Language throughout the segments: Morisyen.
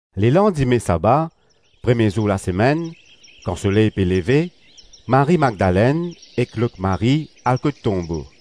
Lelandime saba, premie zour lasemenn, kan soley pe leve, Marie-Madlenn ek lot Marie al kot tonbo.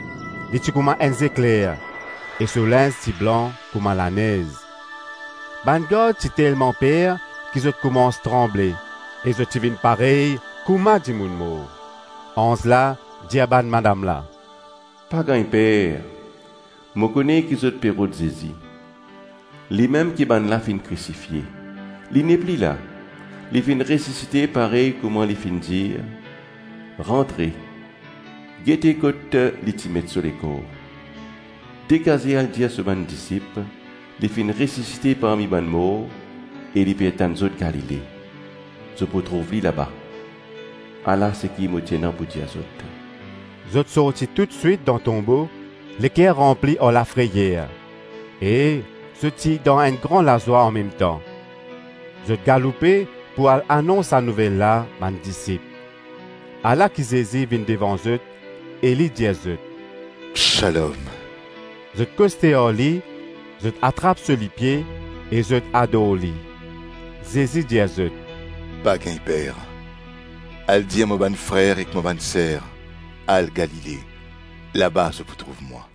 Li ti kouma enn zekler e so linz ti blan kouma lanez. Bann gard ti telman per ki zot koumans tranble e zot ti vinn parey kouma dimoun mor. Anz la dir bann madam la, “Pa gagn per. Mo kone ki zot pe rod Zezi, limem ki bann la finn krisifie; li nepli la, li finn resisite parey kouma li finn dir. Rantre, gete kot ti met so lekor. Degaze al dir so bann disip, ‘Li finn resisite parmi bann mor e li pe atann zot Galile.’ Zot pou trouv li laba. Ala seki mo ti ena pou dir zot.” Zot sorti toutswit dan tonbo leker ranpli ar lafreyer e zot ti dan enn gran lazwa anmemtan. Zot galoupe pou al anons sa nouvel la bann disip. Ala ki Zezi vinn devan zot e li dir zot, “Shalom.” Zot koste ar li, zot atrap so lipie e zot ador li. Zezi dir zot, “Pa gagn per; al dir mo bann frer ek mo bann ser, al Galile; laba zot pou trouv mwa.”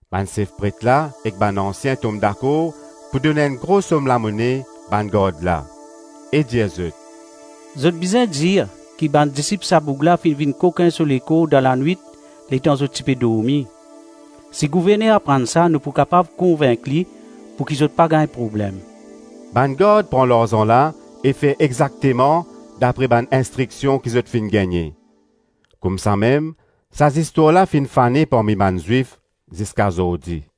Bann sef pret la ek bann ansien tom dakor pou donn enn gro som lamone bann gard la, e dir zot, “Zot bizin dir ki bann disip sa boug la finn vinn kokin so lekor dan lanwit letan zot ti pe dormi. Si gouverner aprann sa, nou pou kapav konvink li pouki zot pa gagn problem.” Bann gard pran larzan la e fer exakteman dapre bann instriksion ki zot finn gagne. Koumsamem sa zistwar la finn fane parmi bann Zwif ziska zordi.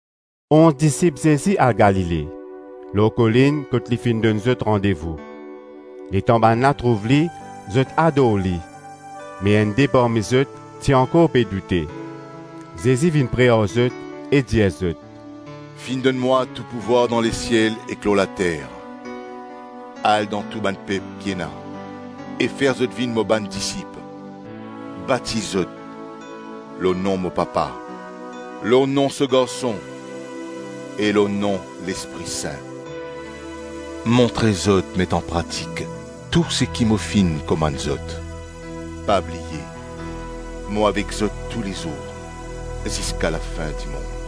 Onz disip Zezi al Galile, lor kolinn kot li finn donn zot randevou. Letan bann la trouv li, zot ador li me enn-de parmi zot ti ankor pe doute. Zezi vinn pre ar zot e dir zot, “Finn donn mwa tou pouvwar dan lesiel ek lor later, Al dan tou bann pep ki ena e fer zot vinn mo bann disip; batiz zot lor nom mo Papa, lor nom so Garson e lor nom Lespri Sin. Montre zot met anpratik tou seki mo finn komann zot. Pa bliye, mo avek zot toulezour ziska lafin-dimonn.”